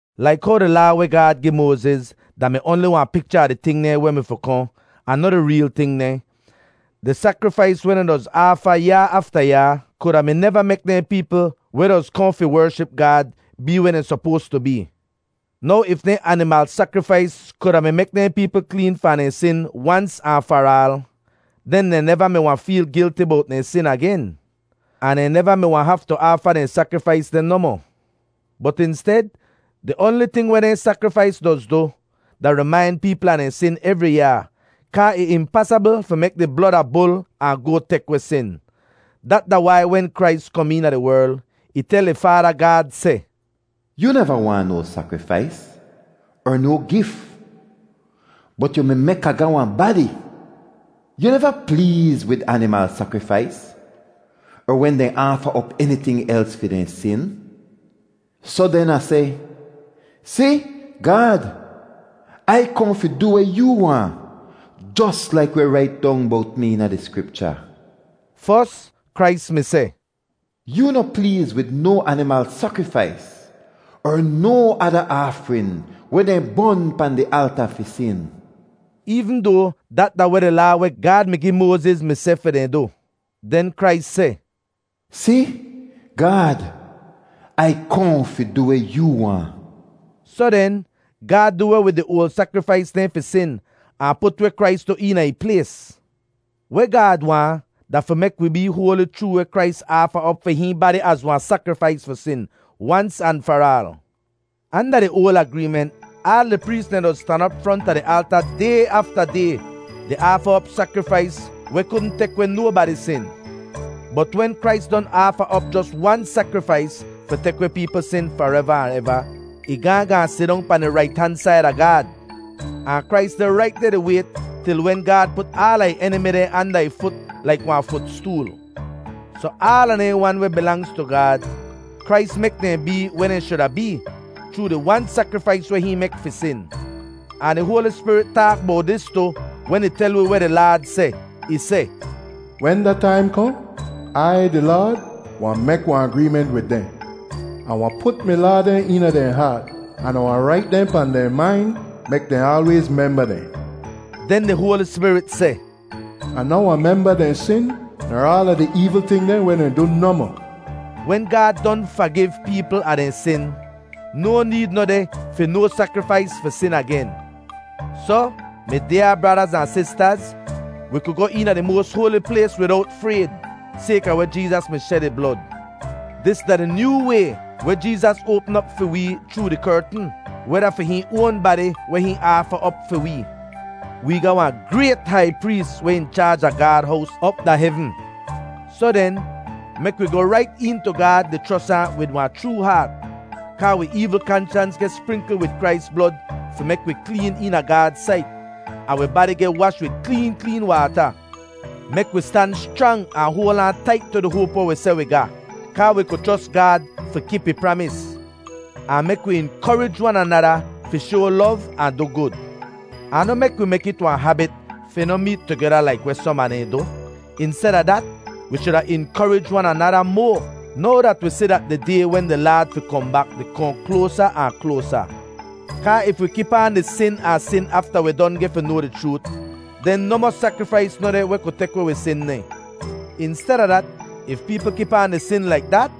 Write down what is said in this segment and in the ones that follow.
Laik how di Laa weh Gaad gi Moaziz da-mi oanli wahn picha a di ting dehn weh mi fi kohn, ahn noh di reel ting dehn, di sakrifais weh dehn doz aafa yaa afta yaa, kuda mi neva mek dehn peepl weh doz kohn fi wership Gaad bee weh dehn sopoas tu bee. Now if dehn animal sakrifais kuda mi mek dehn peepl kleen fahn dehn sin wans ahn far aal, den dehn neva mi wahn feel gilti bowt dehn sin agen, ahn dehn neva mi wahn haftu aafa dehn sakrifais deh nohmoh. Bot insted, di oanli ting weh dehn sakrifais doz du, da rimain peepl a dehn sin evri yaa, kaa ih impasabl fi mek di blod a bul ahn goat tek weh sin. Dat da wai, wen Krais kom eena di werl, ih tel ih Faada Gaad seh, “Yu neva waahn no sakrifais, er no gif, bot yu mi mek Ah ga wahn badi. Yu neva pleez wid animal sakrifais er wen dehn aafa op eniting els fi dehn sin. Soh den Ah seh, ‘Si, Gaad, Ai kohn fi du weh yoo waahn, jos laik weh rait dong bowt mi eena di Skripcha.’” Fos, Krais mi seh, “Yoo noh pleez wid no animal sakrifais er no ada aafrin weh dehn bon pahn di alta fi sin,” eevn doa dat da weh di Laa weh Gaad mi gi Moaziz mi seh fi dehn du. Den Krais seh, “Si, Gaad, Ai kohn fi du weh yoo waahn.” Soh den, Gaad du weh wid di oal sakrifais dehn fi sin, ahn put weh Krais du eena ih plays. Weh Gaad waahn da fi mek wee bee hoali chroo weh Krais aafa op fi hihn badi az wahn sakrifais fi sin, wans an far aal. Anda di oal agreement, aal di prees dehn doz stan op fronta di alta day afta day di aafa op sakrifais weh kudn tek weh nobadi sin. Bot wen Krais don aafa op jos wan sakrifais fi tek weh peepl sin fareva ahn eva, ih gaahn gaahn sidong pahn di rait han said a Gaad. Ahn Krais deh rait deh di wayt til wen Gaad put aala ih enimi dehn anda ih fut laik wahn futstool. Soh aala dehn wan weh bilangz tu Gaad, Krais mek dehn bee weh dehn shuda bee, chroo di wan sakrifais weh hihn mek fi sin. Ahn di Hoali Spirit taak bowt dis tu wen ih tel wi weh di Laad seh. Ih seh, “Wen da taim kohn, Ai, di Laad, wahn mek wahn agreement wid dehn. Ah wahn put mi laa dehn eena dehn haat, an Ah wahn rait dehn pahn dehn main mek dehn aalwayz memba dehn.” Den di Hoali Spirit seh, “Ah noh wahn memba dehn sin ner aala di eevl ting dehn weh dehn du nohmoh.” Wen Gaad don fagiv peepl a dehn sin, no need noh deh fi no sakrifais fi sin agen. Soh, mi dyaa bradaz ahn sistaz, wi ku goh eena Di Moas Hoali Plays widowt frayd sayka weh Jeezas mi shed ih blod. Dis da di nyoo way weh Jeezas oapm op fi wee chroo di kertn, weh da fi hihn oan badi weh hihn aafa op fi wee. Wee ga wahn grayt hai prees weh in chaaj a Gaad hows op da hevn. Soh den, mek wi goh rait een tu Gaad di chros ahn wid wahn chroo haat; kaa wi eevl kanshans geh sprinkl wid Krais blod fi mek wi kleen eena Gaad sait, ahn wi badi geh wash wid kleen kleen waata. Mek wi stan schrang ahn hoal aan tait tu di hoap weh wi seh wi ga, kaa wi ku chros Gaad fi kip ih pramis. Ahn mek wi inkorij wan anada fi shoa lov ahn du gud. Ahn noh mek wi mek it wahn habit fi noh meet tugeda laik weh som a dehn du. Insteda dat, wi shuda inkorij wan anada moa, now dat wi si dat di Day wen di Laad fi kohn bak di kohn kloasa ahn kloasa. Kaa if wi kip aan di sin ahn sin afta wi don geh fi noa di chroot, den nohmoh sakrifais noh deh weh ku tek weh wi sin dehn. Insteda dat, if peepl kip aan di sin laik dat,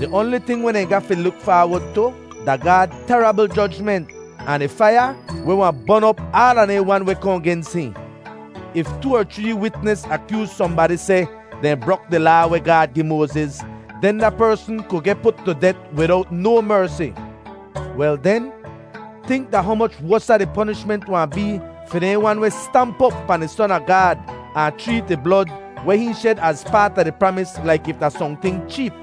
di oanli ting weh dehn ga fi luk faawod tu, da Gaad terabl jojment ahn di faiya weh wahn bon op aala dehn wan weh kohn gens hihn. If too er chree witnis akyooz sohnbadi seh dehn brok di Laa weh Gaad gi Moaziz, den da persn ku geh put tu det widowt no mersi. Wel den, tink da humoch wosa di ponishment wahn bee fi dehn wan weh stamp op pahn di Son a Gaad ahn chreet ih blod weh hihn shed az paat a di pramis laik if da sohnting cheep.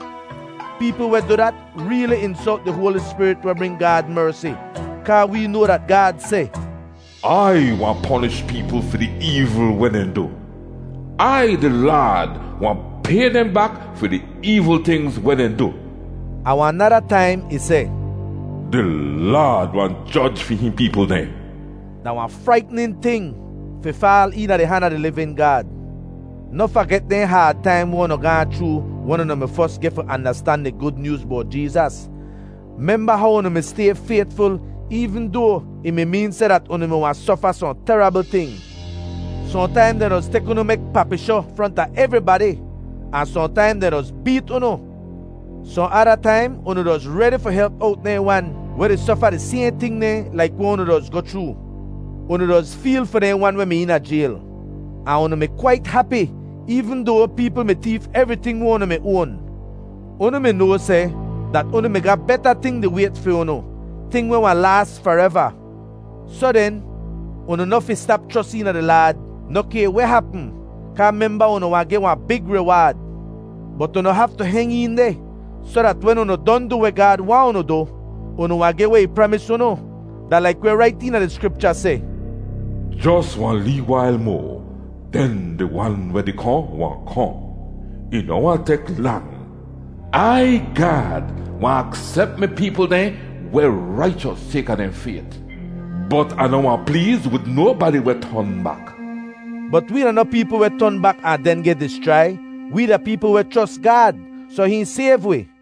Peepl weh du dat reeli insolt di Hoali Spirit weh bring Gaad mersi. Kaa wee noa dat Gaad seh, “Ai wahn ponish peepl fi di eevl weh dehn du. Ai, di Laad, wahn pay dehn bak fi di eevl tingz weh dehn du.” Ahn wahn nada taim ih seh, “Di Laad wahn joj fi hihn peepl dehn.” Da wahn fraitnin ting fi faal eena di han a di livin Gaad! Noh faget dehn haad taim weh unu gaahn chroo wen unu mi fos geh fi andastan di Gud Nyooz bowt Jeezas. Memba how unu mi stay faytful eevn doa ih mi meen seh dat unu mi wahn sofa sohn terabl ting. Sohntaim dehn doz tek unu mek papishoh fronta evribadi, ahn sohntaim dehn doz beet unu. Sohn ada taim unu doz redi fi help owt dehn wan weh di sofa di sayhn ting dehn laik weh unu doz goh chroo. Unu doz feel fi dehn wan weh mi eena jayl. Ahn unu mi kwait hapi eevn doa peepl mi teef evriting weh unu mi oan. Unu mi noa seh dat unu mi ga beta ting di wayt fi unu, ting weh wahn laas fareva. Soh den, unu noh fi stap chros eena di Laad, noh kay weh hapm, kaa memba unu wahn geh wahn big riwaad. Bot unu haftu heng een deh, soh dat wen unu don du weh Gaad waahn unu du, unu wahn geh weh ih pramis unu. Da laik weh rait eena di Skripcha seh, “Jos wahn lee wail moa, den di Wan weh di kohn wahn kohn. Ih noh wahn tek lang. Ai, Gaad, wahn aksep mi peepl dehn weh raichos sayka dehn fayt; bot Ah noh wahn pleez wid nobadi weh ton bak.” Bot wee da noh peepl weh ton bak ahn den geh dischrai. Wee da peepl weh chros Gaad, soh hihn sayv wi.